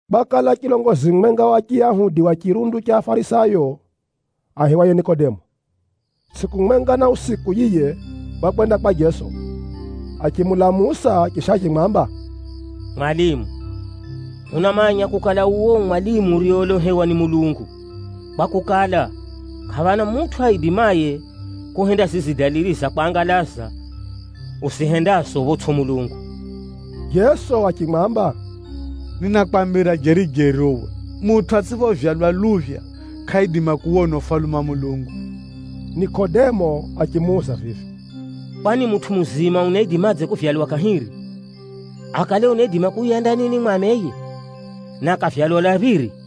Kwakala chilongozi mumwenga wa Chiyahudi wa chirundu cha Afarisayo, aihiwaye Nikodemo. Tsʼiku mwenga na usiku yiye, wakwenda kwa Jeso, achimulamusa chisha achimwamba, “Mwalimu, hunamanya kukala uwe u mwalimu uriyeolohewa ni Mulungu, kwakukala, kʼaphana mutʼu aidimaye kuhenda zizi dalili za kwangalaza uzihendazo photsʼi Mulungu.” Jeso achimwamba, “Ninakwambira jeri-jeri uwe, mutʼu atsʼiphovyalwa luphya, kʼaidima kuwona Ufalume wa Mulungu.” Nikodemo achimuuza vivi, “Kwani mutʼu muzima unaidimadze kuvyalwa kahiri? Akale unaidima kuuya ndanini mwa ameye, na akavyalwa lwa phiri?”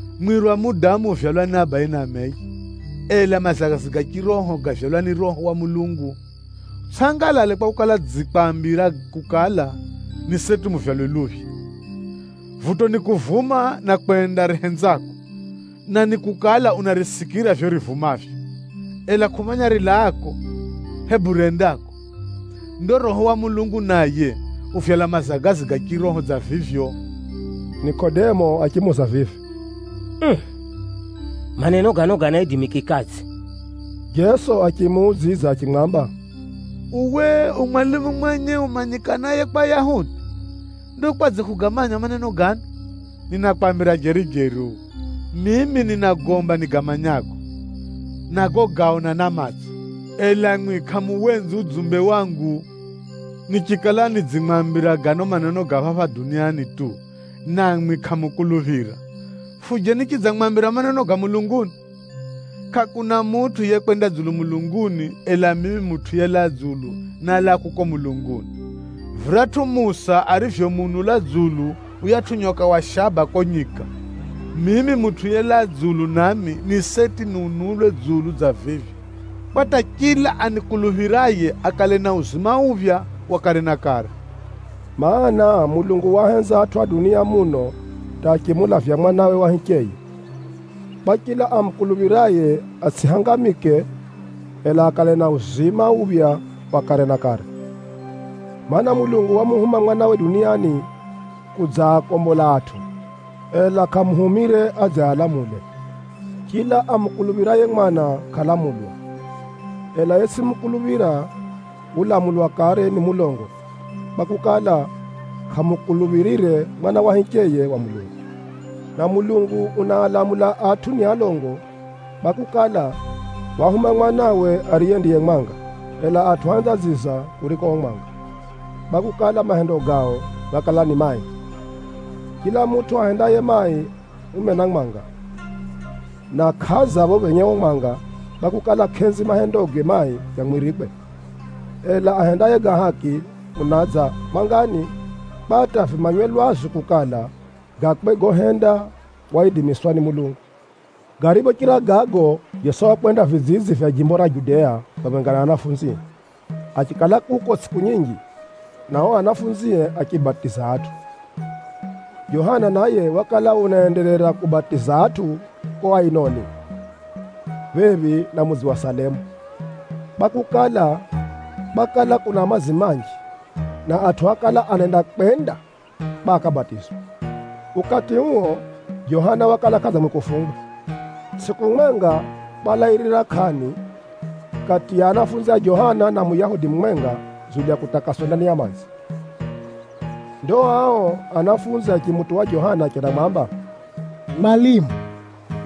Mwiri wa mudamu uvyalwa ni abaye na ameye, ela mazagazi ga chiroho gavyalwa ni Roho wa Mulungu. Utsʼangalale kwakukala, nidzikwambira kukala, ni seti muvyalwe luphya. Vuto nikuvuma na kwenda rihenzako, na nikukala unarisikira vivyo rivumavyo, ela kʼumanya rilaako, hebu rendako. Ndo Roho wa Mulungu naye uvyala mazagazi ga chiroho dza vivyo.” Nikodemo achimuuza vivi, “Uu! Maneno gano ganaidimikikadze?” Jeso achimuudzidza achimwamba, “Uwe u mwalimu mwenye umanyikanaye kwa Ayahudi. Ndo kwadze kʼugamanya maneno gano? Ninakwambira jeri-jeri uwe, mimi ninagomba nigamanyago, na gogaona na matso, ela mwi kʼamuwenzi udzumbe wangu. Nichikala nidzimwambira gano maneno ga phapha duniani tu namwi kʼamukuluphira, fuje nichidzamwambira maneno ga mulunguni? Kʼakuna mutʼu yekwenda dzulu mulunguni, ela mimi Mutʼu yelaa dzulu nálaa kuko mulunguni. Viratʼu Musa arivyomuunula dzulu yuyatʼu nyoka wa shaba kuko nyika, mimi Mutʼu yelaa dzulu nami, ni seti niunulwe dzulu dza vivyo, kwa hata chila anikuluphiraye akale na uzima uphya wa kare na kare.” Maana, Mulungu waahenza atʼu a dunia muno hata achimulavya Mwanawe wa hicheye, kwa chila amukuluphiraye atsʼihangamike, ela akale na uzima uphya wa kare na kare. Maana, Mulungu wamuhuma Mwanawe duniani kudzaativya atʼu, ela kʼamuhumire adze aalamule. Chila amukuluphiraye Mwana kʼalamulwa, ela yetsʼimukuluphira, ulamulwa kare ni mulongo kwakukala, kʼamukuluphirire Mwana wa hicheye wa Mulungu. Na Mulungu unaalamula atʼu ni alongo kwakukala, wahuma Mwanawe duniani, ariye ndiye mwanga, ela atʼu ahenza dziza kuriko o mwanga kwakukala, mahendo gao gákala ni mai. Chila mutʼu ahendaye mai umena mwanga, na kʼadza pho phenye uo mwanga, kwakukala, kʼenzi mahendoge mai gamwirikwe. Ela ahendaye ga haki unadza mwangani, kwa hata vimanywe lwazu kukala, gakwe gohenda waidimiswa ni Mulungu. Gariphochira gago, Jeso wakwenda vidzidzi vya jimbo ra Judea phamwenga na anafunzie, achikala kuko tsʼiku nyinji, na o anafunzie achibatiza atʼu. Johana naye wakala unaenderera kubatiza atʼu kuko Ainoni, phephi na mudzi wa Salemu, kwakukala, kwakala kuna madzi manji, na atʼu ákala anenda kwenda kwa akabatizwe. (Ukati uo, Johana wakala kʼadzangwe kufungwa.) Tsʼiku mwenga, kwalairira kʼani kati ya anafunzi a Johana, na Muyahudi mumwenga dzulu ya kutakaswa ndani ya madzi. Ndo ao anafunzi achimutuwa Johana achendamwamba, “Mwalimu,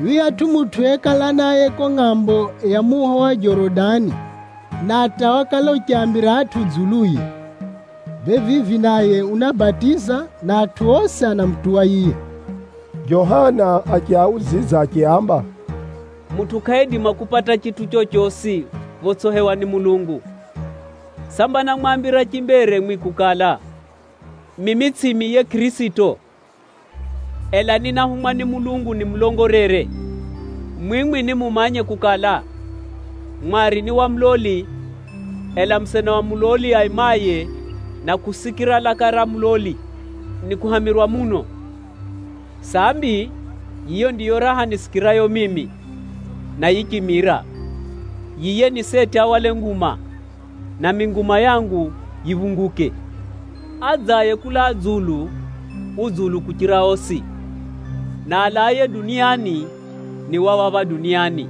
yuyatʼu mutʼu yekala naye kuko ngʼambo ya muho wa Jorodani na hata wakala uchiambira atʼu dzuluye, bee vivi naye unabatiza, na atʼu osi anamutuwa yiye.” Johana achiaudzidza achiaamba, “Mutʼu kʼaidima kupata chitʼu chochosi photsʼihewa ni Mulungu. Samba námwambira chimbere mwi kukala, ‘Mimi tsʼimi yiye Kʼirisito, ela ni náhumwa ni Mulungu nimulongolere’? Mwimwi nimumanye kukala, mwari ni wa muloli, ela musena wa muloli aimaye na kusikira laka ra muloli, nikuhamirwa muno. Sambi, yiyo ndiyo raha nisikirayo mimi, na yichimira. Yiye ni seti ahwale nguma, nami nguma yangu yiphunguke.” Adzaye kulaa dzulu, u dzulu kuchira osi; na alaaye duniani, ni wa phapha duniani,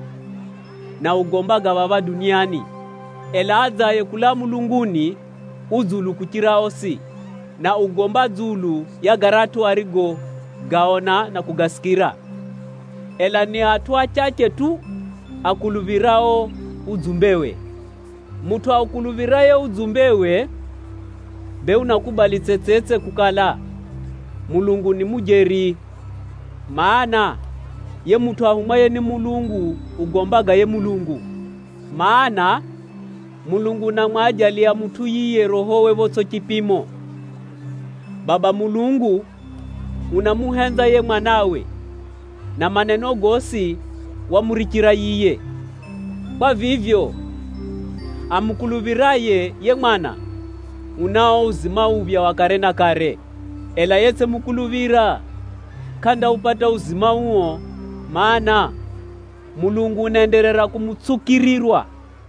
na ugomba ga phapha duniani. Ela adzaye kulaa mulunguni, u dzulu kuchira osi, na ugomba dzulu ya garatʼu arigogaona na kugasikira, ela ni atʼu achache tu akuluphirao udzumbewe. Mutʼu aukuluphiraye udzumbewe, bee unakubali tsetsetse kukala, Mulungu ni mujeri. Maana, yiye mutʼu ahumwaye ni Mulungu ugomba ga yiye Mulungu, mana, Mulungu unamwajaliya mutʼu yiye Rohowe photsʼi chipimo. Baba Mulungu unamuhenza yiye Mwanawe, na maneno gosi wamurichira yiye. Kwa vivyo, amukuluphiraye yiye Mwana, unao uzima uphya wa kare na kare. Ela yetsʼimukuluphira, kʼandaupata uzima uo, mana, Mulungu unaenderera kumutsukirirwa.